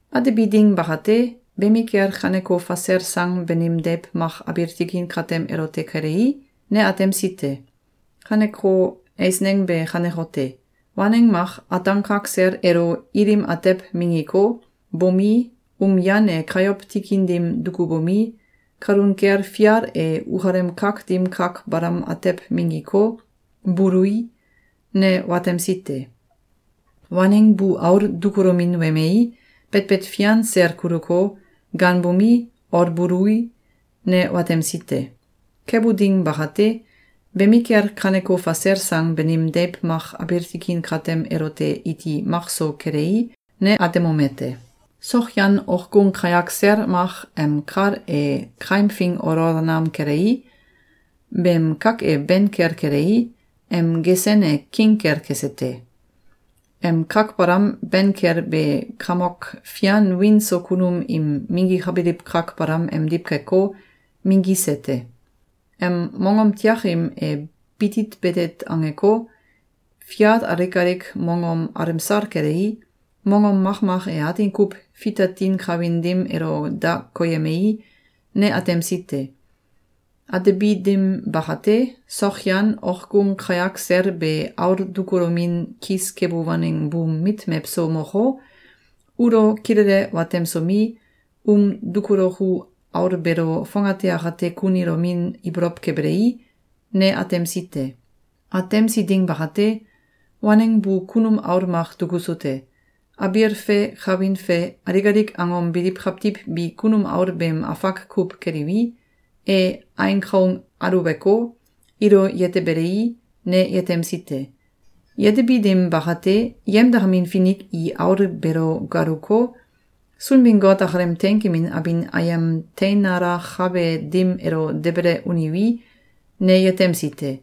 Atebi ding bakate, bemikel kaneko fasel sang banim deiw mak abiil tikin katem elote kelei, ne atemsi te. Kaneko eisneng be kanekote: Waneng mak ataan kak sel elo ilim atew minggiko, bomi, um yan e kayow tikin dim dukubomi, kalun kel fial e ukalem kak dim kak balam atew minggiko, bului, ne watemsi te. Waneng bu aul dukulomin wemei, betbet fian sel kuluko, gaanbomi, olbului, ne watemsi te. Kebu ding bakate, bemikel kaneko fasel sang banim deiw mak abiil tikin katem elote iti mak so kelei, ne atemomete: Sokyan okgung kayak sel mak em kal e kaimfing olol nam kelei, beem kak e ben kel kelei, em gesen e king kel kese te. Em kak balam ben kel be kamok fian wiin so kunum im minggikabiliw kak balam emdiw keko, minggise te. Em mongom tiakim e bitit betet angeko, fial alik alik mongom alemsal kelei, mongom makmak e atin kuw fitatin kawin dim elo da koyemei, ne atemsi te. Atebi dim bakate, sokyan okgung kayak sel be aul dukulomin kis kebu waneng buum mit mewso moko, ulo kilele watemsomi, um dukuloku aul beelo fongate akate kunilomin ibolow kebelei, ne atemsi te. Atemsi ding bakate, waneng bu kunum aul mak dukusu te. Abiil fe kawin fe alik alik angom biliw kawtiw bi kunum aul beem afak kuw keliwi, e ain kaung aluweko, ilo yetebelei, ne yetemsi te. Yetebi dim bakate, yemdakamin finik i aul beelo galuko, Sunbin-Got akalem teinkemin abin ayem teinalakabe dim elo debele uniwi, ne yetemsi te.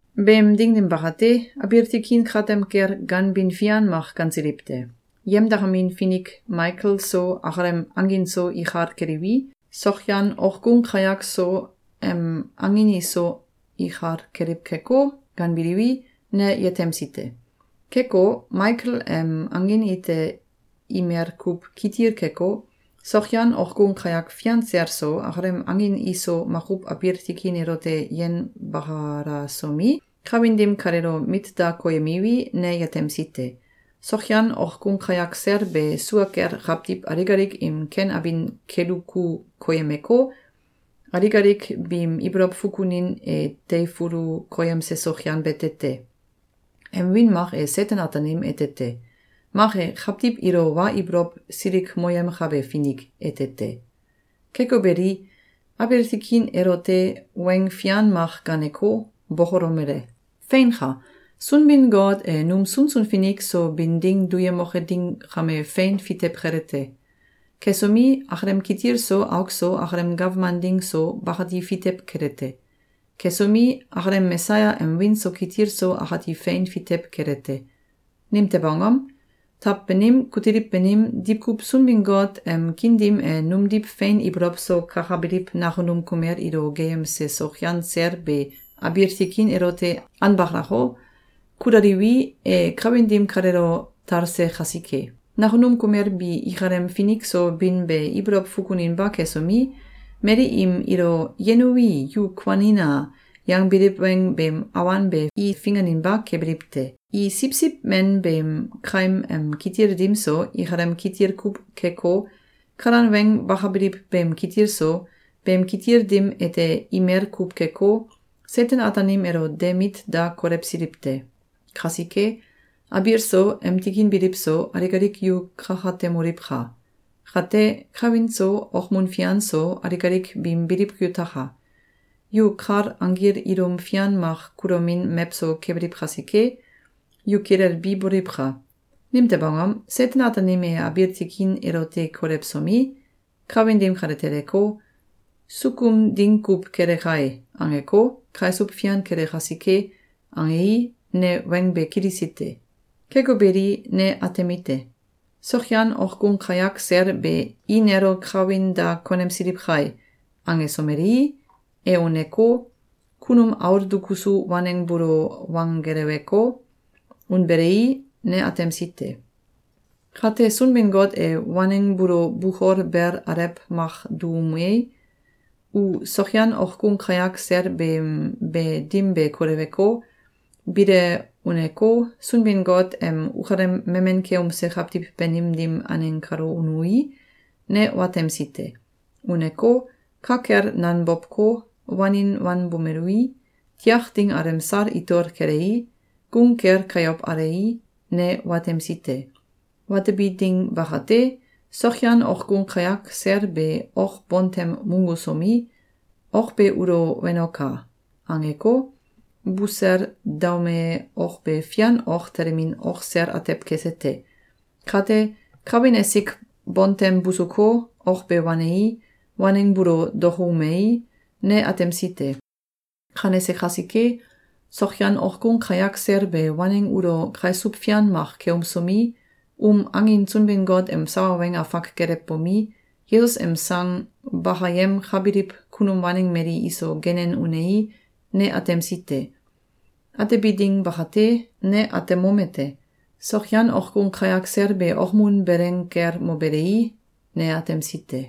Beem ding dim bakate, abiil tikin katem kel ganbin fian mak gansiliw te. Yemdakamin finik Maikel so akalem angin so ikal keliwi, sokyan okgung kayak so em angin iso ikal keliw keko, ganbiliwi, ne yetemsi te. Keko, Maikel em angin ite imel kuw kitil keko, sokyan okgung kayak fian sel so, akalem angin iso makuw abiil tikin elote yenbakalasomi, kawin dim kaleelo mit da koyemiwi, ne yetemsi te. Sokyan okgung kayak sel be sua kel kawtiw alik alik im ken abin keduku koyemeko, alik alik biim ibolow fukunin e teifulu koyemse sokyan bete te. Em wiin mak e Seten-Ataanim ete te. Mak e “Kawtiw ilo Wa Ibolow Silikmoyemkabe Finik” ete te. Keko beli, abiil tikin elote weng fian mak gaaneko, bokolomele: “Feinka! Sunbin-Got e num sunsun finik so bin ding duyemoke ding kame fein fitew kele te. Kesomi, akalem kitil so auk so, akalem gawman ding so, bakati fitew kele te. Kesomi, akalem Mesaya em wiin so kitil so akati fein fitew kele te. Nimtew angom? Taw banim, kutiliw banim, diwkuw Sunbin-Got em kiin dim e numdiw fein ibolow so kakabiliw nakunum kumel ilo geeyemse sokyan sel be abiil tikin elote anbakalako, kulaliwi, e kawin dim kalelo talse kasike. Nakunum kumel bi ikalem finik so bin be ibolow fukuninba kesomi, mali im ilo “Yenuwi, yu kuanina!”, yangbiliw weng beem awan be i finganinba kebiliw te. I Siwsiw Men beem kaim em kitil dim so, ikalem kitil kuw keko, kalan weng bakabiliw beem kitil so, beem kitil dim ete imel kuw keko, Seten-Ataanim elo de mit da kolewsiliw te. Kasike, abiil so, em tikin biliw so, alik alik yu kakatemoliwka! Kate, kawin so, okmun fian so, alik alik biim biliw yutaka! Yu kal anggil ilum fian mak kulomin mewso kebiliw kasike, yu kilelbi boliwka! Nimtew angom? Seten-Ataanim e abiil tikin elote kolewsomi, kawin dim kale teleko, ‘Sukum ding kuw kele kai!’, angeko, kaisuw fian kele kasike.”, angei, ne weng be kilisi te. Keko beli, ne atemite: Sokyan okgung kayak sel be “I nelo kawin da konemsiliw kai!”, angesomelei, e uneko, kunum aul dukusu waneng buulo wanggeleweko, unbelei, ne atemsi te. Kate, Sunbin-Got e waneng buulo bukol bel alew mak duumei, u sokayan okgung kayak sel beem be dim be koleweko, bile uneko, Sunbin-Got em ukalem memen keumse kawtiw banim dim aneng kalo unui, ne watemsi te. Uneko, ka kel nanbowko, wanin wanbomelui, tiak ding alemsal itol kelei, gung kel kayow alei, ne watemsi te. Watebi ding bakate, sokyan okgung kayak sel be ok bontem munggusomi, “Ok be ulo wenoka!”, angeko, busel daume ok be fian ok telemin ok sel atew kese te. Kate, kawin esik bontem busuko, ok be wanei, waneng buulo dokoumei, ne atemsi te. Kanese kasike, sokyan okgung kayak sel be waneng ulo kaisuw fian mak keumsomi, um angin Sunbin-Got em sawa weng afak gelewbomi, Yesus em sang bakayemkabiliw kunum waneng mali iso genen unei, ne atemsi te. Atebi ding bakate, ne atemomete: Sokyan okgung kayak sel be okmun beleng kel mobelei, ne atemsi te.